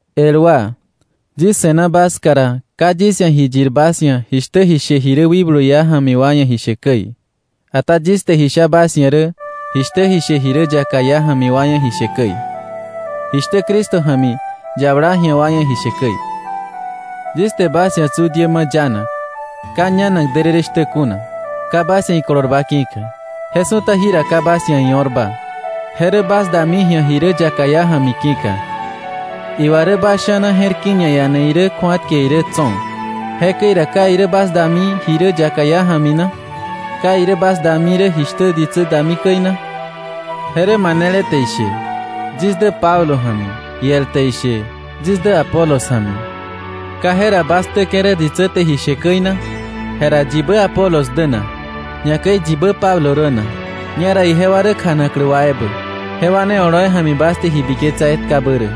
El wa, yis se̱na bas ska ra, ka yis ia̱ ji yir bas ia̱ jishtä ji she ji rä wikblu iá ja̱mi wa ia̱ ji she käi, ata yis te ji sha bas ia̱ rä jishtä ji she ji rä yaka iá ja̱mi wa ia̱ ji she käi, jishtä Cristo ja̱mi yabala ji̱a wa ia̱ ji she käi. Yis te bas ia̱ tsu diä ma̱ yanak, ka ñanak därërë shtä kuna, ka bas ia̱ ikolorba ki̱ka. Je su̱ta jira ka bas ia̱ io̱rba. Je rä bas dami ji̱a ji rä yaka iá ja̱mi ki̱ka. Iwa rä bas sha̱na je̱r ki̱ ñaiane irä kju̱atke irä tso̱. Jekäi ra ¿ka irä bas dami ji rä yaka iá ja̱mi na? ¿Ka irä bas dami rä jishtä ditsä dami käi na? Je rä, manele te ishe, “Yis dä Pablo ja̱mi,” iel te ishe, “Yis dä Apolos ja̱mi.” ¿Ka jera bas ktäke̱ rä ditsä te ji she käi na? Jera ¿yibä Apolos dä na? Ñakäi ¿yibä Pablo rä na? Ñera ijewa rä kjanaklä wa ebä, jewa ne oloi ja̱mi bas te ji biketsa etkabä rä.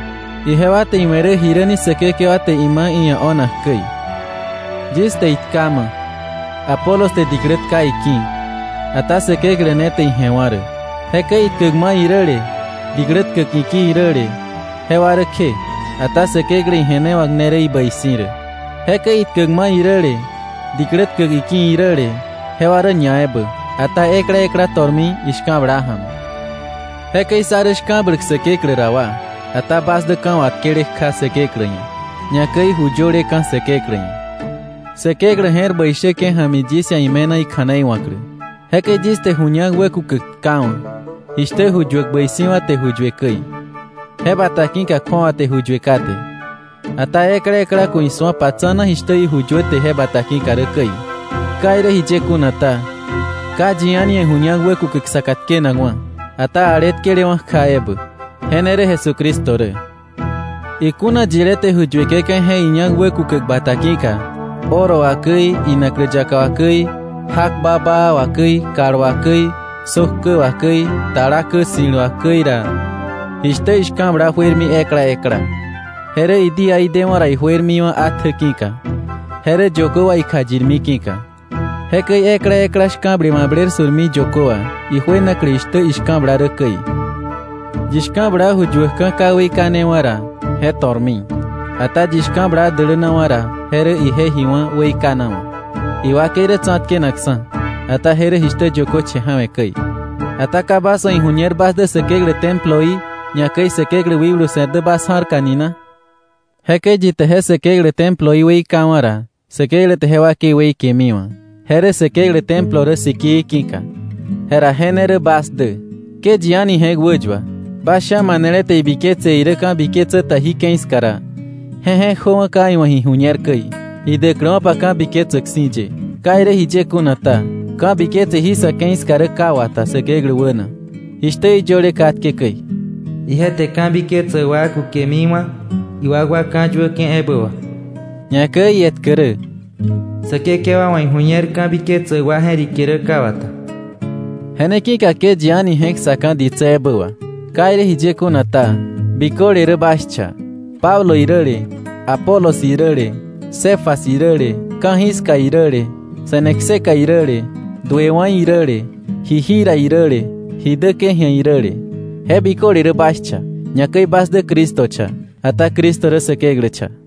Ijewa te iwe̱ rä jiräni Säkekewa te ima̱ iia̱ o̱nak käi. Yis te itkama̱, Apolos te diklä tka iki̱; ata Säkeklä ne te ije̱wa̱ rä. Jekäi itkäkma̱ iräle diklä tkäk iki̱ iräle, jewa rä kje, ata Säkeklä ije̱newa̱k ne rä ibäi si̱ rä. Jekäi itkäkma̱ iräle, diklä tkäk iki̱ iräle, jewa rä ñaebä, ata ekla ekla to̱rmi ishka̱bla ja̱mi. Jekäi sá rä shka̱bläk Säkeklä ra wa, ata bas dä ka̱ watkele kja Säkeklä ia̱, ñakäi ju yöleka̱ Säkeklä ia̱. Säkeklä je̱r bäi shäke̱ ja̱mi yis ia̱ ime̱na ikja̱nei wa̱klä. Jekäi yis te ju ñak wäkukäk tkawa̱, jishtä ju yuäk bäi si̱wa̱ te ju yue käi. Je bata ki̱ka kju̱awa te ju yue kate. Ata ekla ekla ku̱ isu̱opa tsa̱na jishtä iju yuäte je bata ki̱ka rä käi. Ka irä jiye kuna ta, ka yi a̱ni ia̱ ju ñak wäkukäk saka tkenakwa̱, ata ale tkelewa̱ kja ebä. Je ne rä Jesucristo rä. Iku̱na yilé te ju yueke̱ka̱ je iña̱k wäkukäk bata ki̱ka, oro wà käi, inaklä yaka wà käi, jak babaa wà käi, kal wà käi, sök kä wà käi, tala kä ssi̱l wà käi ra, jishtä ishka̱bla juermi ekla ekla, je rä idíaí dewa̱ ra ijuermiwa̱ atjä ki̱ka, je rä yökö wà ikjayirmi ki̱ka. Jekäi ekla ekla shka̱ble mabler su̱rmi yökö wà, ijuenaklä jishtä ishka̱bla rä käi. Yi shka̱bla ju yuäkka̱ ka weikanewa̱ ra, je to̱rmi. Ata yi shka̱bla dälänawa̱ ra, je rä ije ji wá̱ weikanawa̱. Iwakei rä tsa̱tkenakksa̱, ata je rä jishtä yökö che̱ ja̱we̱ käi. Ata ¿ka bas wa̱ iju̱ñer bas dä Säkeklä temploí, ñakäi Säkeklä wikblu se̱r dä bas ja̱rka ni na? Jekäi yi te je Säkeklä temploí weikawa̱ ra, Säkeklä te je wakei weikemiwa̱, je rä Säkeklä templo rä sikii ki̱ka. Jera je ne rä bas dä. Ke yi a̱ni je̱k wäyua. Bas sha̱ manele te ibiketse irä ka̱biketsä ta jí ke̱i ska ra, je je̱k jöwa̱ ka iwa̱ ji ju̱ñer käi, idäkläwa̱pa ka̱biketsäk si̱ ye. Ka irä jiye kuna ta, ka̱biketse jí sa̱ ke̱i ska rä ka wata Säkeklä wäna, jishtä iyöle katke käi: “Ije te ka̱biketsäk wa kukemiwa̱, iwakwa ñawäyuäke̱ ebä wà.” Ñakäi ietkä rä: “Säkekewa wa̱ iju̱ñer ka̱biketsäk wa je̱rike rä ka wata.” Je ne ki̱ka ke yi a̱ni je̱k ssaka̱ ditsä ebä wà. Ka irä jiye kuna ta, biköle rä bas cha, Pablo iräle, Apolos iräle, Cefas iräle, ka̱jiska iräle, se̱ne kseka iräle, duewa̱ iräle, ji jira iräle, ji däke̱ ji̱a iräle. Je biköle rä bas cha, ñakäi bas dä Cristo cha, ata Cristo rä Säkeklä cha.